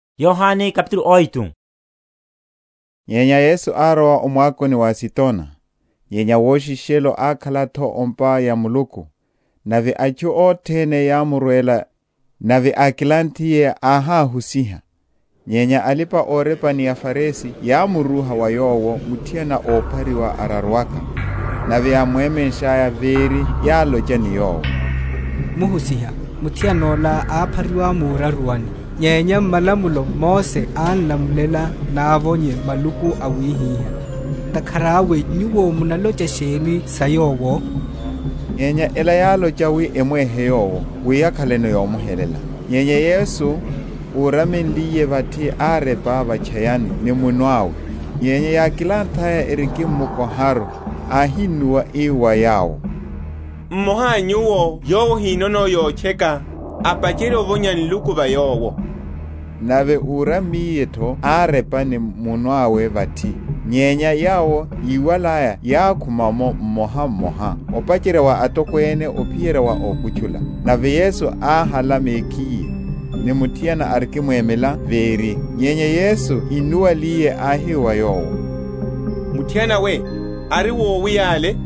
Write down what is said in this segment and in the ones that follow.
Sa muthiana óraruwa. Nyenya Yesu árowa o mwakoni wa Azitona. Nyenya woshishelo ákhala’tho o’mpa ya Muluku, nave atchu othene yámurwela; nave ákilanthiye áháhusiha. Nyenya alipa‐orepa ni aFarisi yámurúha wa Yowo muthiana óphariwa araruwaka, nave yamwemenshaya véri, yálocha ni Yowo, Muhusiha, muthiana ola áphariwa muraruwani. Nyenya m’malamulo Mose án’lamulela návonye maluku awihiha. Ntakhara awe Nyuwo munalocha sheni sa yowo? Nyenya ela yálocha wi emwehe Yowo, wi yakhaleno yómuhelela. Nyenya Yesu, úramenliye vathi árepa va’tchayani ni munwe awe. Nyenya yákilanthaya erikimmukoharu, áhinnuwa, ii wa yawo, Mmoha a nyuwo yowo ahinono yotcheka, apacherye ovonya nluku va yowo. Nave úrammiye tho árepa ni munwe awe vathi. Nyenya yawo, yíwalaya yákhuma’mo mmoha mmoha, opacherya wa atokwene, ophiyerya wa ókutchula: nave Yesu áhala mekhiye, ni muthiana, arikimwemela véri. Nyenya Yesu innuwaliye, áhi wa yowo, Muthiana we, ari wowi yale?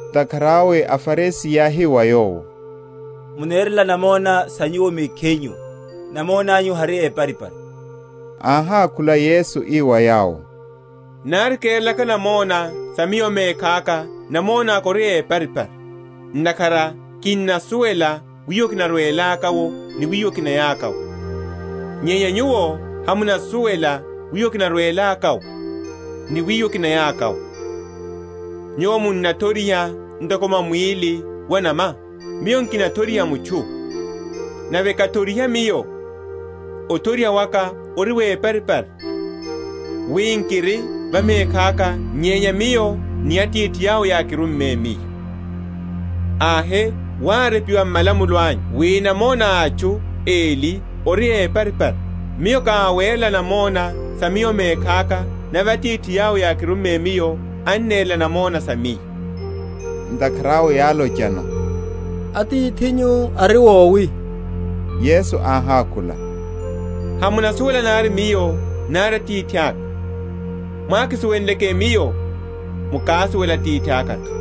Ntakhara awe aFarisi yáhi wa Yowo, Munerela namona sa Nyuwo mekhinyu; namona’nyu hari éparipari. Áhákhula Yesu ii wa yawo, Nari kerelaka namona sa Miyo mekhaka namona’ka ori éparipari; ntakhara kinnasuwela wiwo kinarwelaka’wo ni wiwo kinayaka’wo; nyenya nyuwo hamunasuwela wiwo kinarwelaka’wo, ni wiwo kinayaka’wo. Nyuwo munathoriha ntoko mwa mwíli wa’nama; Miyo nkinathoriha mutchu. Nave kathoriha Miyo, othoriha waka ori wéparipari; wi nkiri va mekhaka, nyenya Miyo ni Atithi yawo yákirumme Miyo. Ahe wárepiwa m’malamulo anyu wi namona a atchu eli ori éparipari. Miyo ká awerela namona sa Miyo mekhaka, nave Atithi yawo yákirumme Miyo anerela namona sa Miyo. Ntakhara awe yálochano, Atithinyu ari wowi? Yesu áhákhula, Hamunasuwela nari Miyo, nari Atithaka; mwákisuwenleke Miyo, mukásuwela Atithaka’tho.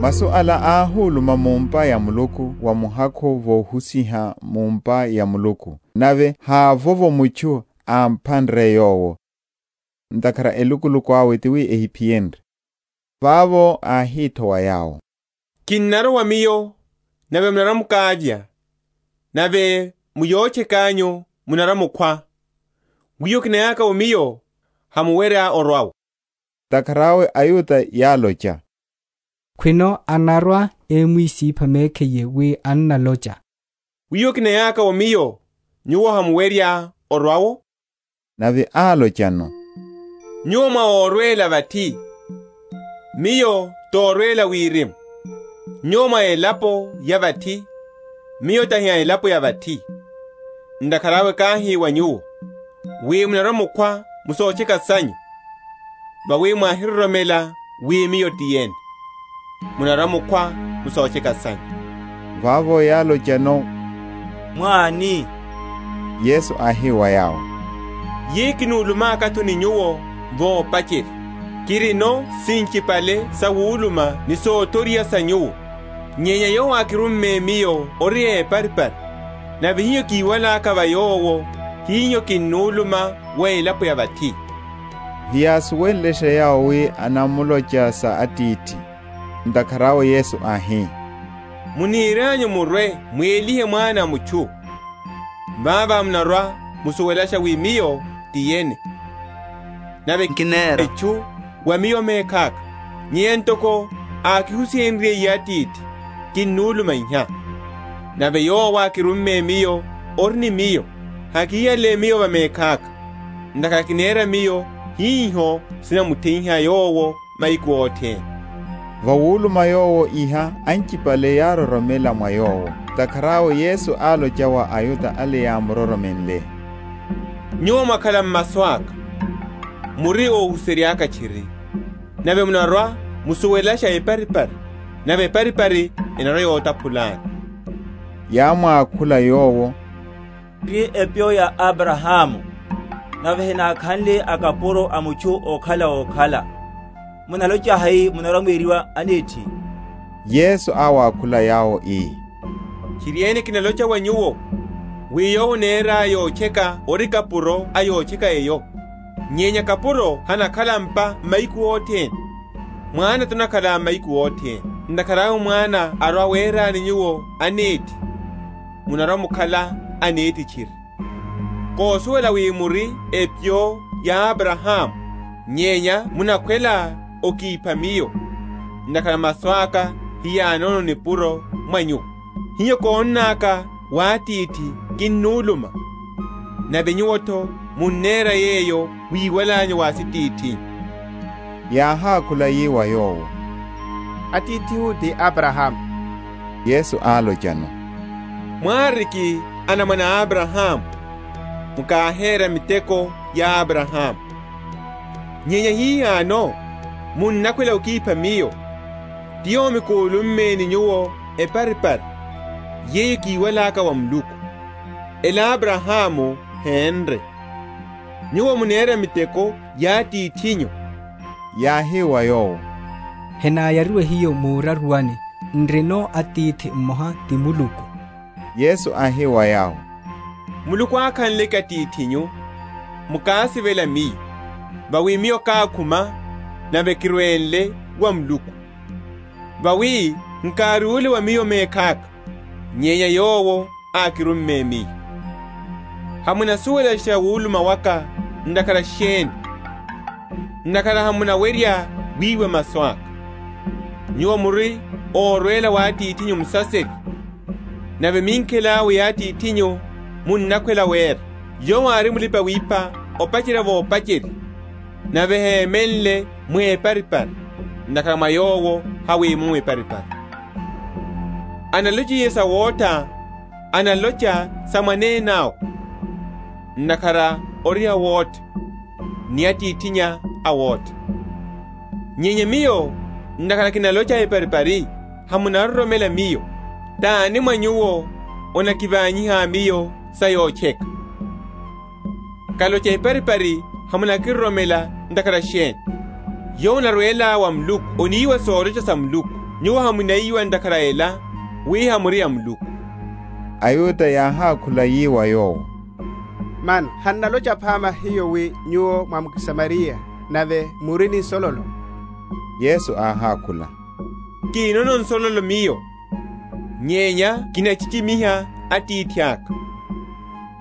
Masu ala áhuluma mu’mpa ya muhakhu wa Muluku vohusiha mu’mpa ya Muluku: nave havovo mutchu ámphanre Yowo, ntakhara elukuluku awe tiwi ehiphiyenrye. Vavo áhi’tho wa yawo; Kinnarowa Miyo, nave munarwa‐mukavya, nave mu yotcheka’nyu munarwa‐mukhwa: wiwo kinayaka’wo Miyo, hamuwerya orwa’wo. Ntakhara awe aYuda yálocha, Khwino anarwa‐imwisipha mekhiye, wi annalocha, Wiwo kinayaka’wo Miyo, nyuwo hamuwerya orwa’wo? Nave álochano, Nyuwo mwá órwela vathi; Miyo torwela wirimu: nyuwo mwá élapo ya vathi; Miyo tahi a elapo ya vathi. Ntakhara awe káhi wa nyuwo, wi munarwa‐mukhwa mu sotcheka sanyu, vawi mwáhiroromela wi Miyo ti yene, munarwa‐mukhwa mu sotcheka sanyu. Vavo yálochano, Mwá ani? Yesu áhi wa yawo, Yeyo kúlummaka’tho ni nyuwo vopacherya. Kirino sinchipale sawuluma ni sothoriha sa nyuwo; nyenya Yowo ákirumme Miyo ori éparipari; nave hiho kiwalaka va Yowo, hiho kinnuluma wa elapo ya vathi. Heyásuwenlesha yawo wi anamlocha sa Atithi. Ntakhara awe Yesu áhi, Munirianyu murwe m’muwelihe Mwana a mutchu, vavo munarwa‐musuwelasha wi Miyo ti yene, nave nkinera etchu wa Miyo mekhaka, nyenya ntoko ákihusihenryiye Atithi, kinuluma iha. Nave Yowo ákirumme Miyo ori ni Miyo; hakihiyale Miyo va mekhaka; ntakhara kinera Miyo hiho sinamuthe?-?yiha Yowo mahiku othene. Vawuluma Yowo iha, anchipale yároromela mwa Yowo. Ntakhara awe Yesu álocha wa aYuda ale yámuro?-?romenle, Nyuwo mwakhala m’masu aka, muri óhuserya’ka tchiri; nave munarwa‐musuwelasha eparipari, nave eparipari enarwa‐yotaphulani. Yámwakhula Yowo, N’ri epyo ya Abrahamu, nave henákhanle akapuro a mutchu okhala wokhala; munalocha hai, munarwa‐mweriwa anethi? Yesu áwakhula yawo, ii, Tchiriene, kinalocha wa nyuwo, wi yowo anera yotcheka ori kapuro a yotcheka eyo. Nyenya kapuro hanakhala m’pa mahiku othene: mwana tanakhala mahiku othene. Ntakhara awe mwana arwa awerani nyuwo anethi, munarwa‐mukhala anethi tchiri. Kosuwela wi muri epyo ya Abrahamu; nyenya munakhwela okipha Miyo, ntakhara masu aka heyanono nipuro mwa nyuwo. Hiho konnaka wa Atithi, kinnuluma; nave nyuwo’tho munera yeyo mwíwalanyu wa asitithinyu. Yáhákhula yi wa Yowo, Atithihu ti Abrahamu. Yesu álochano, Mwáriki anamwane a Abrahamu, mukáhera miteko ya Abrahamu. Nyenya hihano munakhwela okipha Miyo, ti yomi kúlumme ni nyuwo eparipari, yeyo kiwalaka wa Muluku: ela Abrahamu hénre. Nyuwo munera miteko ya atithinyu. Yáhi wa Yowo, Henáyariwe hiyo muraruwani; n’rino Atithi mmoha ti Muluku. Yesu áhi wa yawo, Muluku ákhanleke Atithinyu, mukásivela Miyo: vawi Miyo kákhuma, nave kirwenle wa Muluku; vawi nkárúle wa Miyo mekhaka, nyenya Yowo ákirumme Miyo. Hamunasuwelasha wuluma waka ntakhara sheni? ntakhara hamuwerya wiwa masu aka. Nyuwo muri órwela wa atithinyu Musaserya, nave minkhela awe ya atithinyu munnakhwela wera. Yowo ári mulipa‐wipha opacherya vopacherya, nave hémenle mu eparipari, ntakhara mwa yowo hamwimomo eparipari. Analochiye sawotha, analocha sa mwanene awe; ntakhara ori awotha, ni atithinnya a wotha. Nyenya Miyo, ntakhara kinalocha eparipari, hamunaroromela Miyo. Tani mwa nyuwo anakivanyiha Miyo sa yotcheka? Kalocha eparipari, hamunakiroromela ntakhara sheni? Yowo anarwela wa Muluku aniwa solocha sa Muluku; nyuwo hamuniwa ntakhara a ela wi hamuri a wa Muluku. AYuda yáhákhula yi wa Yowo, Mano hannalocha phama hiyo wi Nyuwo mwá mSamariya, nave muri ni nsololo? Yesu áhákhula, Nkinono nsololo Miyo; nyenya kinachichimiha Atithaka,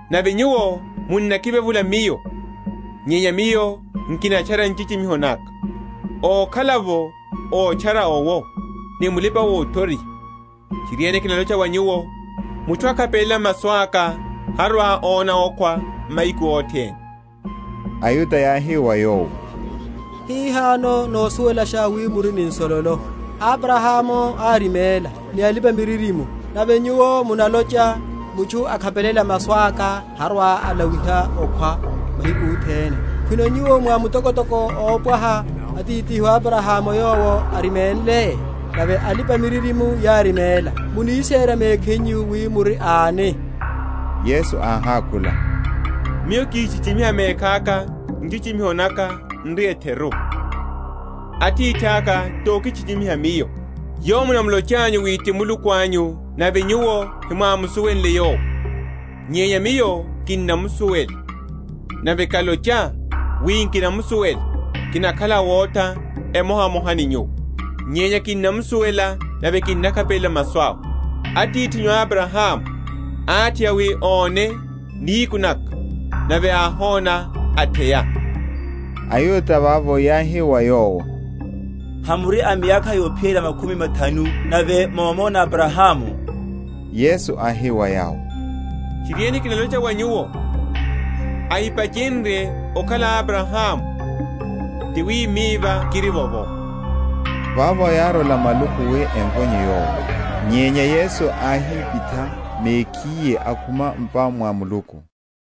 nave nyuwo munnakivevula Miyo. Nyenya Miyo nkinatchara nchichimiho naka; ókhala’vo ótchara owo, ni mulipa‐othoriha. Tchiriene, kinalocha wa nyuwo, Mutchu akhapelela masu aka, harwa‐ona okhwa mahiku othene. AYuda yáhi wa Yowo, Hihano nosuwelasha wi muri ni nsololo. Abrahamu áriméla, ni alipa‐miririmo; nave Nyuwo munalocha, mutchu akhapelela masu aka, harwa‐alawiha okhwa mahiku othene. Khwino Nyuwo mwá mutokotoko ópwaha atithihu Abrahamu yowo áriménle? nave alipa‐miririmo yáriméla; munisera mekhinyu wi muri ani? Yesu áhákhula, Miyo kíchichimiha mekhaka, nchichimiho naka n’ri etheru: Atithaka tokichichimiha Miyo; Yowo munamulochanyu wi ti Muluku anyu; nave nyuwo hemwámusuwenle Yowo; nyenya Miyo kinnamusuwela; nave kalocha, wi nkinamusuwela, kinakhala awotha emohamoha ni nyuwo: nyenya kinnamusuwela, nave kinnakhapelela masu awe. Atithinyu Abrahamu átheya wi óne nihiku naka; nave áhona, atheya. AYuda vavo yáhi wa Yowo, Hamuri a miyakha yophiyerya makhumi mathanu, nave mohona Abrahamu? Yesu áhi wa yawo, Tchiriene, kinalocha wa nyuwo, ahipachenrye okhala Abrahamu ti wi Miva kirivovo. Vavo yárola maluku wi emvonye Yowo: nyenya Yesu áhipitha mekhiye, akhuma m’pa mwa Muluku.